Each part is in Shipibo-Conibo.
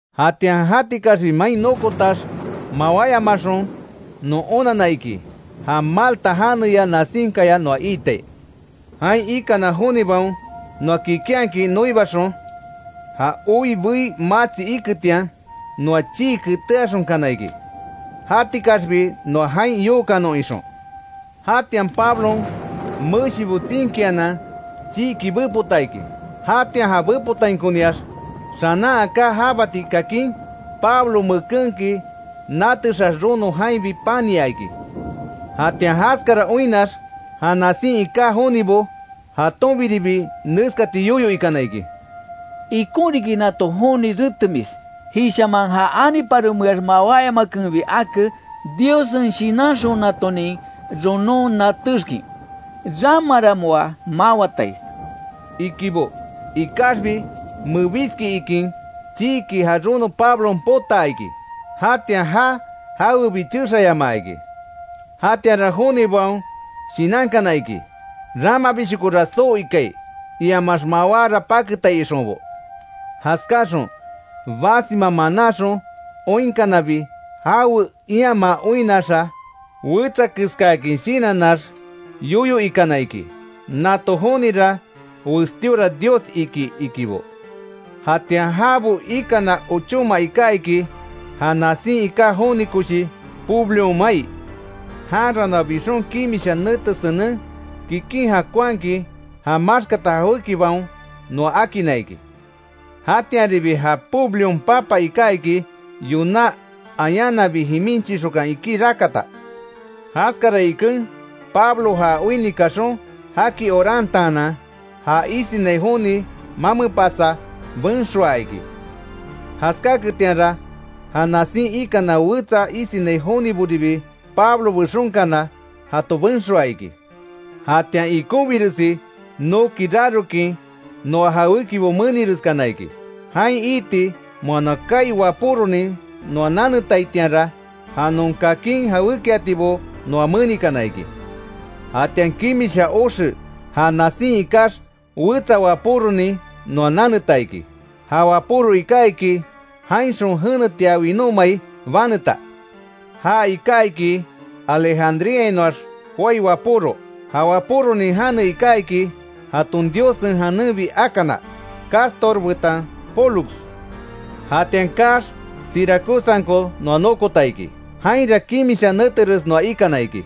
Jatian jatikaxbi main nokotax mawáyamaxon, non onanna iki, ja Malta janeya nasinkaya noa iitai. Jain ikana jonibaon noa kikinhakin noibaxon, ja oi bei matsi iketian, noa chii keteaxonkana iki, jatikaxbi noa jain yookanon ixon. Jatian Pablon meshibo tsinkianan chiiki bepota iki. Jatian ja bepotainkoniax xanan aká jabati kakin, Pablo mekenki natexax rono jainbi pania iki. Jatian jaskara oinnax, ja nasin iká jonibo jatonbiribi neskati yoyo ikana iki: “Ikon riki nato joni retemis, jishaman ja aniparomeax mawáyamakenbi ake, Diossen shinanxonatonin ronon natéxkin, ramara moa mawatai”, ikibo. Ikaxbi mebiski ikin, chiiki ja rono Pablon potaa iki, jatian já jawebi chexayamaa iki. Jatianra jonibaon shinankana iki, ramabishokora soo ikai, iamax mawára paketai ixonbo. Jaskáaxon basima manáxon oinkanabi, jawe iamaa oinnaxa, wetsa keskáakin shinanax yoyo ikana iki, nato jonira westíora dios iki, ikibo. Jatian jabo ikana ochóma iká iki, ja nasin iká joni koshi Publion mai, janra noa bixon kimisha nete senen, kikin jakonhakin ja maxkata jawékibaon noa akinna iki. Jatianribi ja Publion papa iká iki, yoná ayananbi jimin chixokan iki rakata. Jaskara iken Pablo já oinni kaxon jaki orantaanan, ja isinai joni mamepasa, benxoa iki. Jaskáaketianra, ja nasin ikana wetsa isinai joniboribi, Pablo bexonkana jato benxoa iki. Jatian ikonbiresi noki rarokin moa jawékibo menireskana iki. Jain iiti moa kaai wapóronin noa nanetaitianra, ja non kakin jawékiatibo noa menikana iki. Jatian kimisha oxe ja nasin ikax, wetsa wapóronin noa naneta iki. Ja wapóro iká iki, jainxon jenetia winómai baneta. Ja iká iki Alejandríainoax joái wapóro. Ja wapóronin jane iká iki, jaton diosen janenbi akana, Cástor betan Pólux. Jatian kaax, Siracusanko noa nokota iki, jainra kimisha neteres noa ikana iki.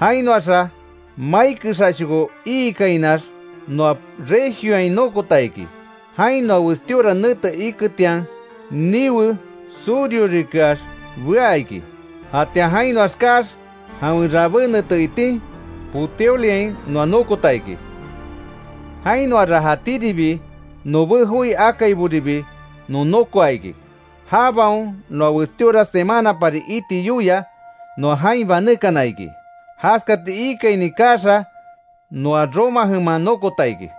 Jainoaxa mai kexashoko iikainax, noa Regioain nokota iki. Jain noa westíora nete iketian, niwe surhorikeax bea iki. Jatian jainoax kaax, jawen rabé nete itin Puteoliain noa nokota iki. Jainoara jatíribi nobé joi akaiboribi non nokoa iki. Jabaon noa westíora semanapari iti yoia, noa jain banékana iki, jaskati iikaini kaaxa, noa Roma jeman nokota iki.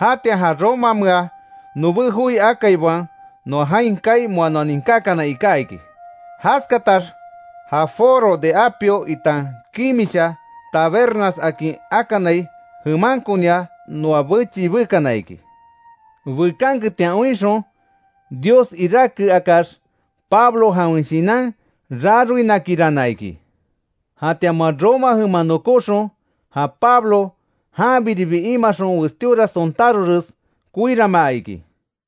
Jatian ja Romamea nobé joi akaibaon noa jain kaai moa ninkákana iká iki. Jaskatax, ja Foro de Apio itan Kimisha Tabernas akin akanai jemankonia noa bechii bekana iki. Bekanketian oinxon Dios iráke akax, Pablo jawen shinan raroinakirana iki. Jatian moa Roma jeman nokóxon, ja Pablo janbiribi imaxon westíora sontárores koiranmaa iki.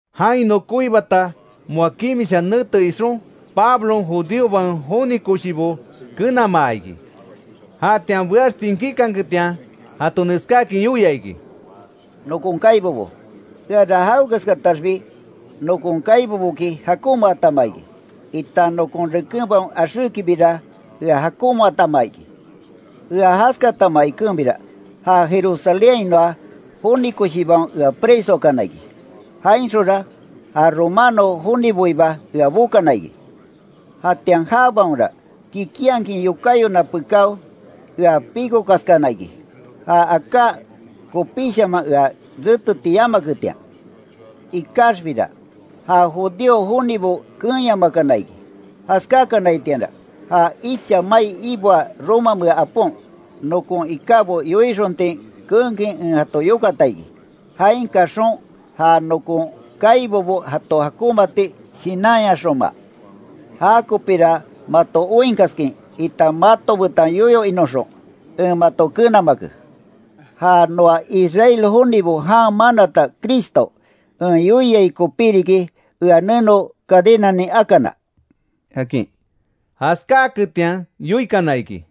Jain nokoibata moa kimisha nete ixon Pablon judíobaon joni koshibo kenamaa iki. Jatian beax tsinkíkanketian jato neskáakin yoia iki: —Nokon kaibobo, eara jawekeskataxbi nokon kaiboboki jakonmaatama iki, itan nokon rekenbaon axékibira ea jakonmaatama iki. Ea jaskatama ikenbira ja Jerusalénhainoa joni koshibaon ea presoakana iki. Jainxonra ja romano joniboiba ea bokana iki. Jatian jabaonra, kikinhakin yokáyona pekáo, ea píkokaskana iki, ja aká kopíshaman ea reteti yamaketian. Ikaxbira ja judío jonibo keenyamakana iki. Jaskákanaitianra ja icha mai iboaa romamea apon, nokon ikábo yoixontin keenkin en jato yokata iki, jain kaxon ja nokon kaibobo jato jakonmaati shinanyaxonma. Jakopira mato oinkaskin, itan mato betan yoyo inoxon, en mato kenamake. Ja noa Israel jonibo jan manata Cristo en yoiai kopí riki, ea neno cadenanin akana —akin. Jaskáaketian yoikana iki: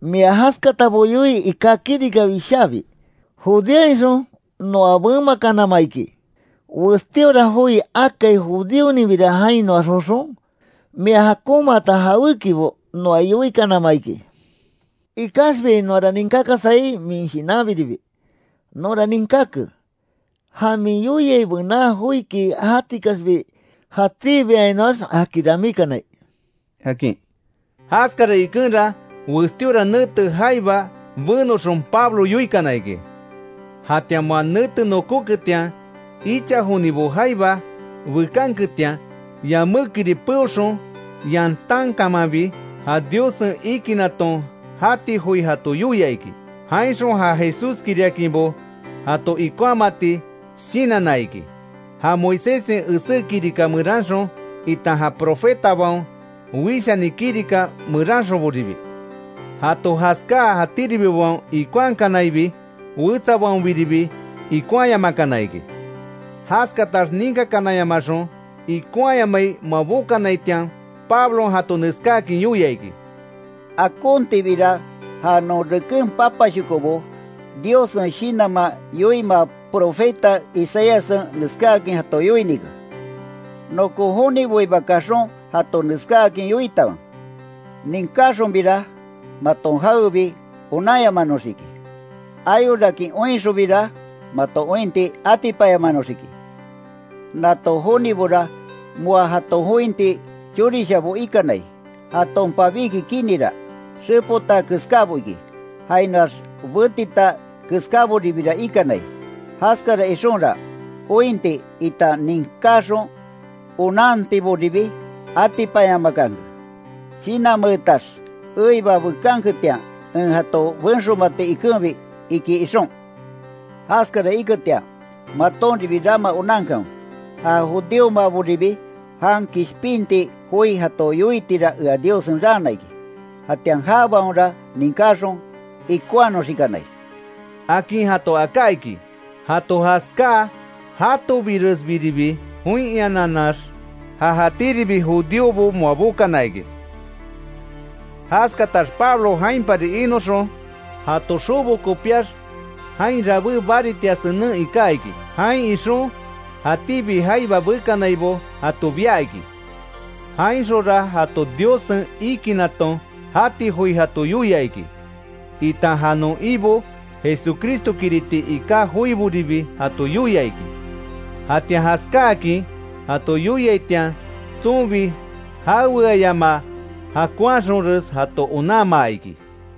—Mia jaskatabo yoii iká kirika wishábi Judeainxon noa bemakanama iki. Westíora joi akai judíoninbira jainoax joxon, mia jakonmaata jawékibo noa yoikanama iki. Ikaxbi noara ninkákasai, min shinanbiribi. Nonra ninkáke, ja min yoiai bená joiki jatikaxbi jatíbiainoax jaki ramíkanai —akin. Jaskara ikenra, westíora nete jaiba benoxon, Pablo yoikana iki. Jatian moa nete nokóketian, icha jonibo jaiba bekanketian, yamékiri peoxon yantánkamanbi, ja Diossen ikinaton jati joi jato yoia iki, jainxon ja Jesúskiriakinbo, jato ikonhamati shinanna iki, ja Moiséssen esé kirika meranxon, itan ja profetabaon wishani kirika meranxonboribi. Jato jaskáa, jatíribibaon ikonhakanaibi, wetsabaonbiribi ikonhaayamakana iki. Jaskatax ninkakananyamaxon ikonhayamai moa bokanaitian, Pablon jato neskáakin yoia iki: —Akontibira ja non reken papashokobo, Diossen Shinanman yoimaa Profeta Isaíassen neskáakin jato yoinike: ‘Nokon joniboiba kaxon jato neskáakin yoitanwe: Ninkáxonbira, maton jawebi onanyamanoxiki. Ayorakin oinxonbira maton ointi atipanyamanoxiki. Nato jonibora moa jaton jointi chorishabo ikanai. Jaton pabíki kinira, xepota keskábo iki; jainoax betita keskáboribira ikanai; jaskara ixonra, ointi, itan ninkáxon onantiboribi atipanyamakanke; shinanmeetax eiba bekanketian en jato benxomati ikenbi’, iki ixon. Jaskara iketian, matonribi rama onankanwe, ja judíomaboribi jan kishpinti joi jato yoitira ea Diossen raana iki. Jatian jabaonra ninkáxon ikonhanoxikanai —akin jato aká iki. Jato jaskáa, jatobiresbiribi join iananax, ja jatíribi judíobo moa bokana iki. Jaskatax Pablo jainpari inoxon, jato xobo kopíax jain rabé baritia senen iká iki. Jain ixon jatíbi jaiba bekanaibo jato bia iki. Jainxonra jato Diossen ikinaton jati joi jato yoia iki, itan ja non Ibo Jesucristokiriti iká joiboribi jato yoia iki. Jatian jaskáakin jato yoiaitian tsonbi jaweayamaa jakonhaxonres jato onanmaa iki.